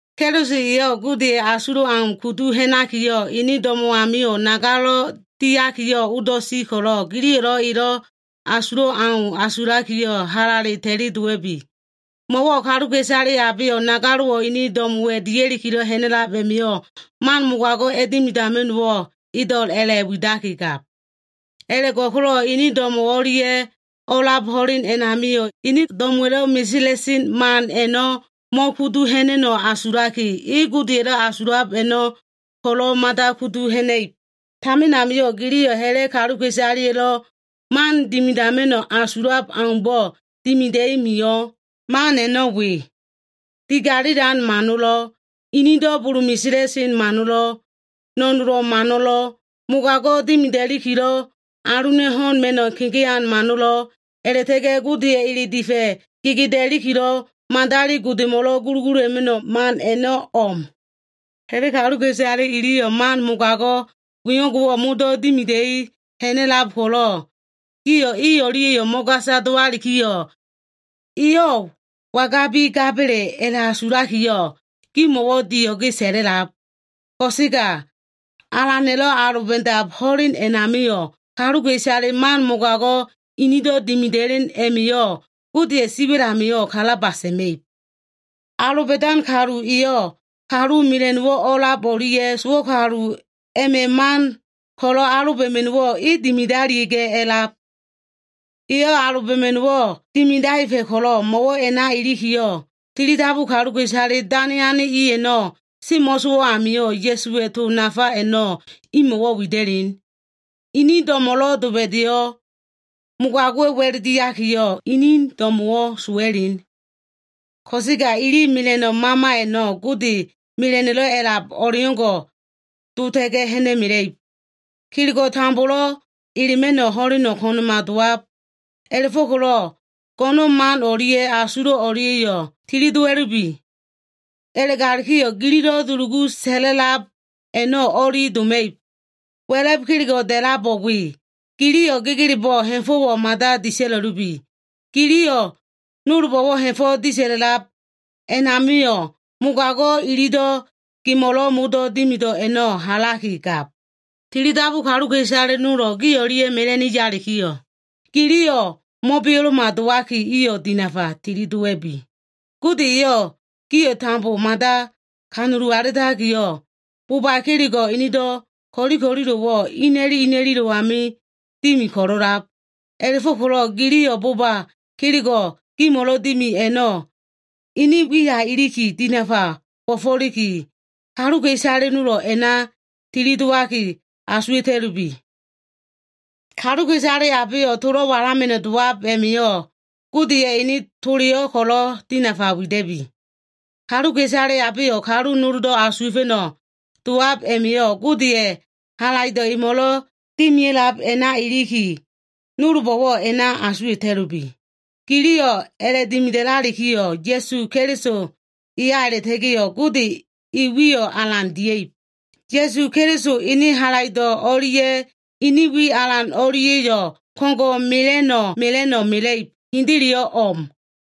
Keliso eyo꞉ Godeya꞉ asulo꞉ au kudu ha꞉nakiyo꞉, ene do꞉mo꞉ amio꞉ nagalo꞉ diakiyo꞉ odo꞉ si ko꞉lo꞉, giliyo꞉lo꞉ elo꞉ asulo꞉ o꞉leau a꞉la꞉asulaki, halale ta꞉li dowa꞉bi. Mo꞉wo꞉ kaluka꞉isale abeyo꞉ nagalo꞉wo꞉ ene do꞉mo꞉wa dia꞉likilo꞉ ha꞉na꞉lab a꞉ma꞉yo꞉, man mogago꞉ a꞉dimidama꞉no꞉wo꞉ edo꞉l a꞉la꞉widaki gab. A꞉la꞉go꞉ko꞉lo꞉ e do꞉mo꞉ o꞉lia꞉lo꞉ o꞉a꞉lab ho꞉len a꞉namio꞉, ene do꞉mo꞉wa꞉lo꞉ meselan man a꞉no꞉ mo꞉kudu ha꞉na꞉no꞉ asulaki, e Godeya꞉lo꞉ asulab a꞉no꞉ ko꞉lo꞉ mada kudu ha꞉na꞉ib. Tamin amio꞉ giliyo꞉ ha꞉la꞉ kaluka꞉isaleya꞉lo꞉ man dimidama꞉no꞉ asulab o꞉leaumbo꞉ dimida꞉i mio꞉. Man a꞉no꞉ we. Digalilan mano꞉lo꞉, inido꞉ bulu meselan mano꞉lo꞉, no꞉nolo꞉ mano꞉lo꞉, mogago꞉ dimidama꞉nikilo꞉ aluna꞉ ho꞉n ma꞉no꞉ kegean mano꞉lo꞉, a꞉la꞉ta꞉ga꞉ Godeya꞉ ele difa꞉ gedeakilo꞉, madali godemo꞉lo꞉ gulugulula꞉ma꞉no꞉ man a꞉no꞉ o꞉m. Ha꞉la꞉ kaluka꞉isale iliyo꞉ man mogago꞉ wengo꞉wo꞉ modo꞉ dimida꞉i ha꞉na꞉lab ko꞉lo꞉, gio꞉ i o꞉lia꞉yo꞉ mo꞉gasa dowalikiyo꞉, iyo꞉ wangabi gaba꞉le a꞉la꞉asulakiyo꞉, gimo꞉wo꞉ dio꞉ge sa꞉la꞉lab. Ko꞉sega Alana꞉lo꞉ aloba꞉dab ho꞉len a꞉namio꞉, kaluka꞉isale man mogago꞉ inido꞉ dimida꞉len a꞉ma꞉yo꞉ Godeya꞉ siwa꞉l amio꞉ kalaba sa꞉ma꞉ib. Aloba꞉dan kalu eyo꞉ kalu mela꞉no꞉lo꞉ o꞉a꞉lab o꞉lia꞉ sowo꞉ kalu o꞉lia꞉ma꞉ man ko꞉lo꞉ aloba꞉ma꞉no꞉wo꞉ e dimidalia꞉ga꞉ a꞉lab. Eyo꞉ aloba꞉ma꞉no꞉wo꞉ dimidaefa꞉ ko꞉lo꞉, mo꞉wo꞉ a꞉na ilikiyo꞉, tilidabu kaluka꞉isale dane ane i a꞉no꞉ semo꞉sowo꞉ amio꞉, Ya꞉suwa꞉ to nafa a꞉no꞉ imo꞉wo꞉ wida꞉len. Ini do꞉mo꞉lo꞉ doba꞉da꞉yo꞉, mogago꞉wa꞉ wa꞉l diakiyo꞉, ini do꞉mo꞉wo꞉ sowa꞉len. Ko꞉sega ili mela꞉no꞉ mama a꞉no꞉, Gode mela꞉no꞉le a꞉lab o꞉leo꞉ngo꞉ dota꞉ga꞉ ha꞉na꞉mela꞉ib. Kelego꞉ tambolo꞉ elema꞉no꞉ ho꞉leno꞉ ko꞉na꞉ma dowab. A꞉la꞉fo꞉ko꞉lo꞉ go꞉no꞉n man o꞉lia꞉ asulo꞉ o꞉lia꞉yo꞉ tili dowa꞉lubi. A꞉la꞉ga꞉lalikiyo꞉ gililo꞉ dulugu sa꞉la꞉lab a꞉no꞉ o꞉li doma꞉ib. Wa꞉la꞉b kelego꞉ da꞉labo꞉ we. Giliyo꞉ gegelebo꞉ ha꞉fo꞉wo꞉ mada disa꞉la꞉lubi. Giliyo꞉ nolbo꞉lo꞉ ha꞉fo꞉ disa꞉lab a꞉namio꞉, mogago꞉ ililo꞉ gimo꞉lo꞉ modo꞉ dimido꞉ a꞉no꞉ halaki gab. Tilidabu kaluka꞉isale i nolo꞉ gi o꞉lia꞉ mela꞉ni yalikiyo꞉, giliyo꞉ mo꞉beo꞉lo꞉ma dowaki, iyo꞉ dinafa tilidowa꞉bi. Gode eyo꞉ gio꞉ tambo mada kanulu alitakiyo꞉, boba kelego꞉ enedo꞉ ko꞉li ko꞉lilo꞉wo꞉ ina꞉li ina꞉lilo꞉mo꞉ dimi ko꞉lo꞉lab. A꞉la꞉fo꞉ko꞉lo꞉ giliyo꞉ boba kelego꞉ gimo꞉lo꞉ dimi a꞉no꞉ ene wiya iliki dinafa bo꞉fo꞉liki, kaluka꞉isale nolo꞉ a꞉na tilidowaki asuwa꞉ta꞉lubi. Kaluka꞉isale abeyo꞉ tolo꞉ walama꞉no꞉ dowab a꞉ma꞉yo꞉ Godeya꞉ ene toleyo꞉ ko꞉lo꞉ dinafa wida꞉bi. Kaluka꞉isale abeyo꞉ kalu noldo꞉ asuwa꞉fa꞉no꞉ dowab a꞉ma꞉yo꞉, Godeya꞉ halaido꞉ emo꞉lo꞉ dimia꞉lab a꞉na iliki, nolbo꞉wo꞉ a꞉na asuwa꞉ta꞉lubi. Giliyo꞉ a꞉la꞉dimida꞉lalikiyo꞉ Ya꞉su Keliso eya a꞉la꞉ta꞉ga꞉ Gode e wiyo꞉ alan dia꞉ib. Ya꞉su Keliso ene halaido꞉ o꞉lia꞉ ene wi alan o꞉lia꞉yo꞉ ko꞉ngo꞉ mela꞉no꞉ mela꞉no꞉ mela꞉ib. Hendeleyo꞉ o꞉m.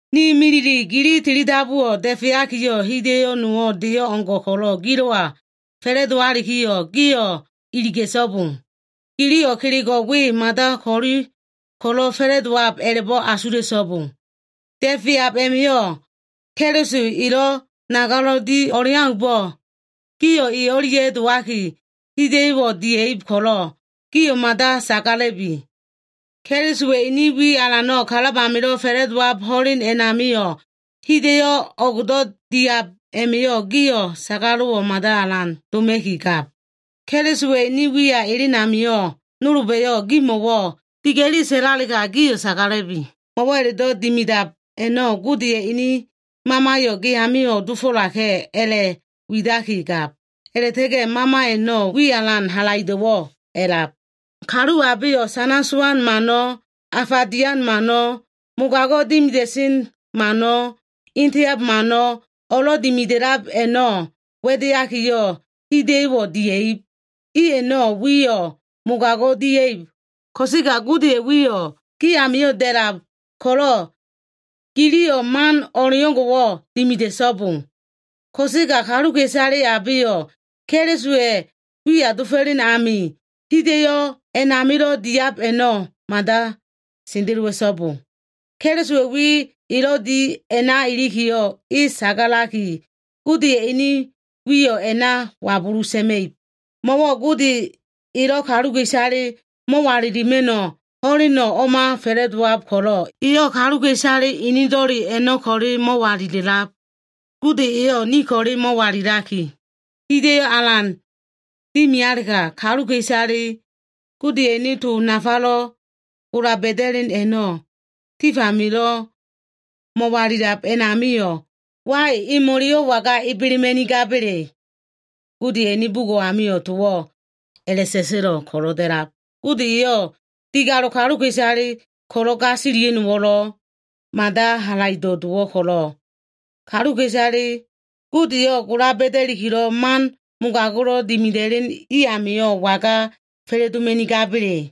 Ni milile, gi tilidabuwo꞉ da꞉feakiyo꞉, hida꞉yo꞉ nowo꞉ deyo꞉ o꞉ngo꞉ ko꞉lo꞉ gilo꞉wa fa꞉la꞉dowalikiyo꞉, gio꞉ iliga꞉so꞉bo. Giliyo꞉ kelego꞉ we mada ko꞉li ko꞉lo꞉ fa꞉la꞉dowab a꞉la꞉bo꞉ asula꞉so꞉bo. Da꞉feab a꞉namio꞉ Keliso elo꞉ nagalo꞉ di o꞉leaumbo꞉, gio꞉ e o꞉lia꞉ dowaki hida꞉yo꞉wo꞉ diab ko꞉lo꞉, gio꞉ mada sagala꞉bi. Kelisowa꞉ ene wi alano꞉ kalab amilo꞉ fa꞉la꞉dowab ho꞉len a꞉namio꞉, hida꞉yo꞉ o꞉gdo꞉ diab a꞉ma꞉yo꞉ gio꞉ sagalo꞉wo꞉ mada alan doma꞉ki gab. Kelisowa꞉ ene wiya elen amio꞉, nolba꞉yo꞉ gimo꞉wo꞉ diga꞉li sa꞉lalega, gio꞉ sagala꞉bi. Mo꞉wo꞉ a꞉la꞉do꞉ dimidab a꞉no꞉, Godeya꞉ ene Mamayo꞉ ge amio꞉ dofo꞉laka꞉ a꞉la꞉ widakigab. A꞉la꞉ta꞉ga꞉ Mama a꞉no꞉ wi alan halaido꞉wo꞉ a꞉lab. Kalu abeyo꞉ sana sowan mano꞉, afa dian mano꞉, mogago꞉ dimida꞉sen mano꞉, eteab mano꞉, o꞉lo꞉ dimida꞉lab a꞉no꞉ wa꞉deakiyo꞉, hida꞉yo꞉wo꞉ dia꞉ib. I a꞉no꞉ wiyo꞉ mogago꞉ dia꞉ib ko꞉sega, Godeya꞉ wiyo꞉ gi amio꞉ da꞉lab ko꞉lo꞉, giliyo꞉ man o꞉leo꞉ngo꞉wo꞉ dimida꞉so꞉bo. Ko꞉sega kaluka꞉isale abeyo꞉ Kelisowa꞉ wiya dofo꞉len ami hida꞉yo꞉ a꞉namilo꞉ diab a꞉no꞉ mada sendelowa꞉so꞉bo. Kelisowa꞉ wi elo꞉ di a꞉na ilikiyo꞉, e sagalaki Godeya꞉ ene wiyo꞉ a꞉na wabulu sa꞉ma꞉ib. Mo꞉wo꞉ Gode elo꞉ kaluka꞉isale mo꞉walilima꞉no꞉ ho꞉leno꞉ o꞉ma fa꞉la꞉dowab ko꞉lo꞉, eyo꞉ kaluka꞉isale enedo꞉le a꞉no꞉ ko꞉le mo꞉walila꞉lab. Gode eyo꞉ ni ko꞉le mo꞉walilaki, hida꞉yo꞉ alan dimialega, wai, kaluka꞉isale Godeya꞉ ene to nafalo꞉ gola ba꞉da꞉len a꞉no꞉ tif amilo꞉ mo꞉walilab a꞉namio꞉, imo꞉leyo꞉ waga ebelema꞉nigaba꞉le? Godeya꞉ ene bugo꞉ amio꞉ towo꞉ a꞉la꞉sa꞉sa꞉lo꞉ ko꞉lo꞉ da꞉lab, Gode eyo꞉ digalo꞉ kaluka꞉isale ko꞉lo꞉ gasilia꞉no꞉wo꞉lo꞉ mada halaido꞉ dowo꞉ ko꞉lo꞉, kaluka꞉isale Godeyo꞉ gola ba꞉dakilo꞉ man mogago꞉lo꞉ dimida꞉len i amio꞉ waga fa꞉la꞉doma꞉nigaba꞉le?